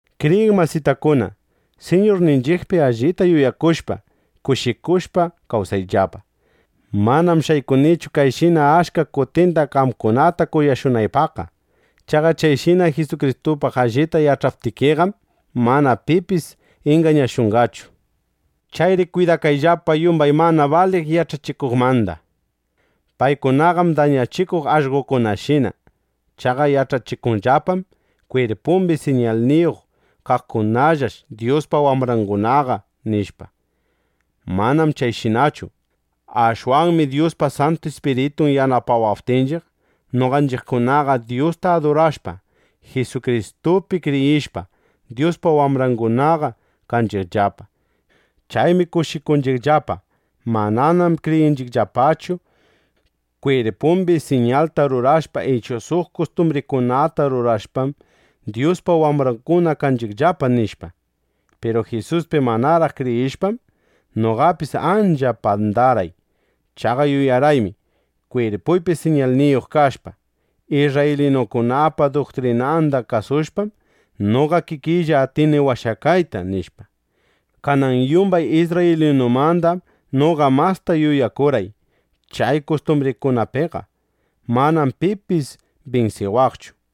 Kriyiq masitakuna, Siñurninchiqpi allita yuyakushpa, kushikushpa kawsayllapa. Manam shaykunichu kayshina achka kutinda qamkunata kunashunaypaqqa. Chaqa chayshina Jisukristupaq allita yach'aptikiqam, mana pipis ingañashunqachu. Chayri kwidakayllapa yumbay mana baliq yach'achikuqmanda. Paykunaqam dañachikuq allqokunashina. Chaqa yach'achikunllapam: Kwirpumbi siñalniyuq kaqkunallash Dyuspa wambrangunaqa, nishpa. Manam chayshinachu. Ashwanmi Dyuspa Santu Ispiritun yanapawaptinchiq, noqanchiqkunaqa Dyusta adurashpa, Jisukristupi kriyishpa, Dyuspa wambrangunaqa kanchiqllapa. Chaymi kushikunchiqllapa. Mananam kriyinchiqllapachu: Kwirpumbi siñalta rurashpa ichu suq kustumbrikunata rurashpam, Dyuspa wambranguna kanchiqllapa, nishpa. Piru Jisuspi manaraq kriyishpam, noqapis ancha pandarqay. Chaqa yuyarqaymi: Kwirpuypi siñalniyuq kashpa, isrraylinukunapa duktrinanda kasushpam, noqa kikiylla atini washakayta, nishpa. Kanan yumbay isrraylinumandam noqa masta yuyakurqay chay kustumbrikunapiqa. Manam pipis binsiwaqchu.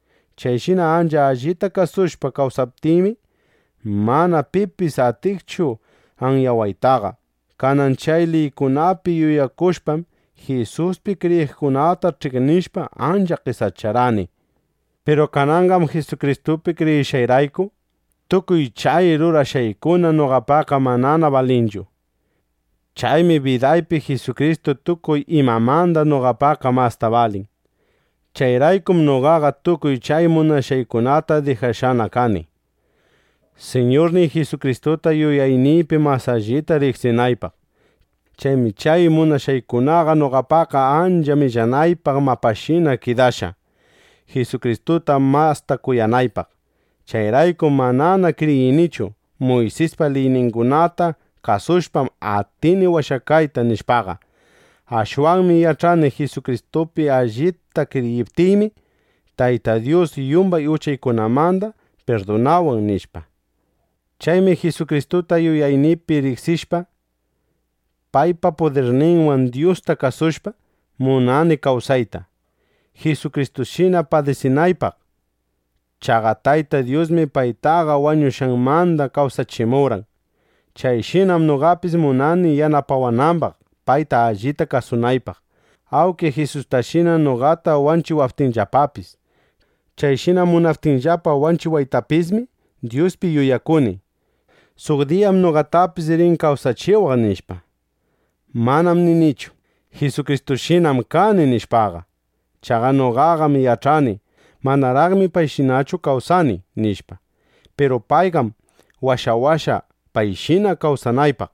Chayshina ancha allita kasushpa kawsaptiymi, mana pipis atiqchu anyawaytaqa. Kanan chay liykunapi yuyakushpam, Jisuspi kriyiqkunata ch'iqnishpa, ancha qesacharqani. Piru kananqam Jisukristupi kriyishqayrayku, tukuy chay rurashqaykuna noqapaqqa manana balinchu. Chaymi bidaypi Jisukristu tukuy imamanda noqapaqqa masta balin. Chayraykum noqaqa tukuy chay munashqaykunata dijashqana kani, Siñurniy Jisukristuta yuyayniypi mas allita riqsinaypaq. Chaymi chay munashqaykunaqa noqapaqqa ancha millanaypaq mapashinana kidashqa, Jisukristuta masta kuyanaypaq. Chayraykum manana kriyinichu: Muysispa liyningunata kasushpam, atini washakayta, nishpaqa. Ashwanmi yach'ani: Jisukristupi allipta kriyiptiymi, Tayta Dyus yumbay uchaykunamanda pirdunawan, nishpa. Chaymi Jisukristuta yuyayniypi riqsishpa, paypa pudirninwan Dyusta kasushpa, munani kawsayta, Jisukristushina padisinaypaq. Chaqa Tayta Dyusmi paytaqa wañushqanmanda kawsachimurqan. Chayshinam noqapis munani yanapawanambaq, payta allita kasunaypaq, awnki Jisustashina noqata wanchiwaptinllapapis. Chayshina munaptinllapa wanchiwaytapismi, Dyuspi yuyakuni: Suq diyam noqatapis rin kawsachiwaq, nishpa. Manam ninichu: Jisukristushinam kani, nishpaqa. Chaqa noqaqam yach'ani: Manaraqmi payshinachu kawsani, nishpa. Piru payqam washawashqa, payshina kawsanaypaq.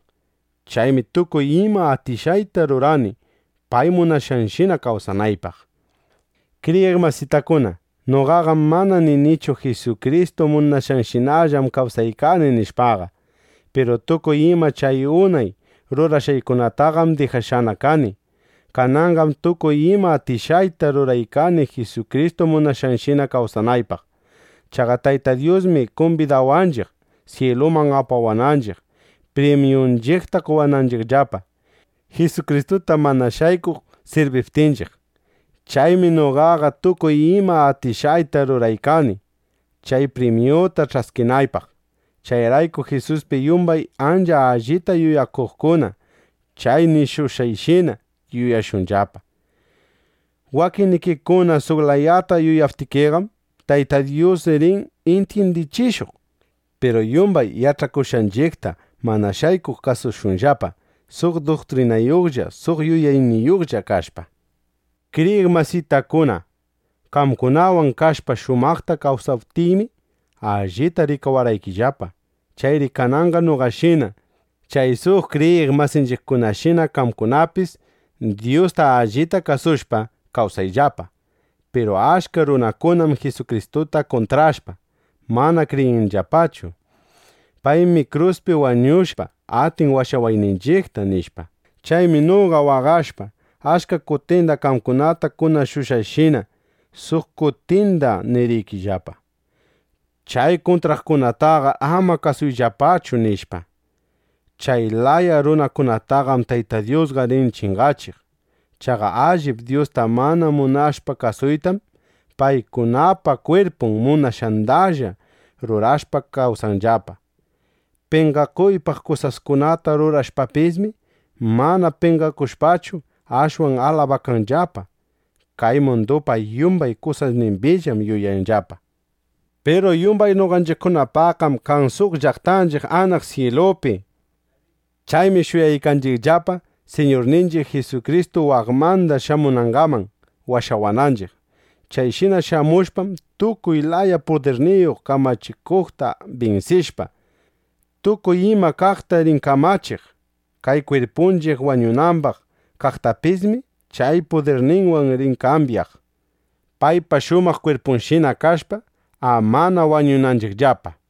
Chaymi tukuy ima atishqayta rurani, pay munashqanshina kawsanaypaq. Kriyiq masitakuna, noqaqam mana ninichu: Jisukristu munashqanshinallam kawsaykani, nishpaqa. Piru tukuy ima chay unay rurashqaykunataqam dijashqana kani. Kananqam tukuy ima atishqayta ruraykani Jisukristu munashqanshina kawsanaypaq. Chaqa Tayta Dyusmi kumbidawanchiq, syiluman apawaqninchiq, primyunchiqta qowananchiqllapa, Jisukristuta mana shaykuq sirbiptinchiq. Chaymi noqaqa tukuy ima atishqayta ruraykani, chay primyuta ch'askinaypaq. Chayrayku Jisuspi yumbay ancha allita yuyakuqkuna chay nishushqayshina yuyashunllapa. Wakinnikikuna suq layata yuyaptikiqam, Tayta Dyus rin intyindichishuq. Piru yumbay yach'akushqanchiqta mana shaykuq kasushunllapa, suq duktrinayuqlla suq yuyayniyuqlla kashpa. Kriyiq masitakuna, qamkunawan kashpa shumaqta kawsaptiymi, allita rikawarqaykillapa. Chayri kananqa noqashina, chay suq kriyiq masinchiqkunashina qamkunapis Dyusta allita kasushpa, kawsayllapa. Piru achka runakunam Jisukristuta kuntrashpa, mana kriyinllapachu: Paymi kruspi wañushpa, atin washawayninchiqta, nishpa. Chaymi noqa waqashpa, achka kutinda qamkunata kunashushqayshina, suq kutinda niriykillapa: “Chay kuntraqkunataqar ama kasuyllapachu”, nishpa. Chay laya runakunataqam Tayta Dyusqa rin chingachiq. Chaqa allip Dyusta mana munashpa kasuytam, paykunapa kwirpun munashqandalla rurashpa kawsanllapa. Penqakuypaq kusaskunata rurashpapismi, mana penqakushpachu, ashwan alabakanllapa. Kay mundupa yumbay kusasnimbillam yuyanllapa. Piru yumbay noqanchiqpaqqam kan suq llaqtanchiq anaq syilupi. Chaymi shuyaykanchiqllapa, Siñurninchiq Jisukristu waqmanda shamunangaman washawananchiq. Chayshina shamushpam, tukuy laya pudirniyuq kamachikuqta binsishpa, tukuy ima kaqta rin kamachiq. Kay kwirpunchiq wañunambaq kaqtapismi chay pudirninwan rin kambyaq, paypa shumaq kwirpunshina kashpa, amana wañunanchiqllapa.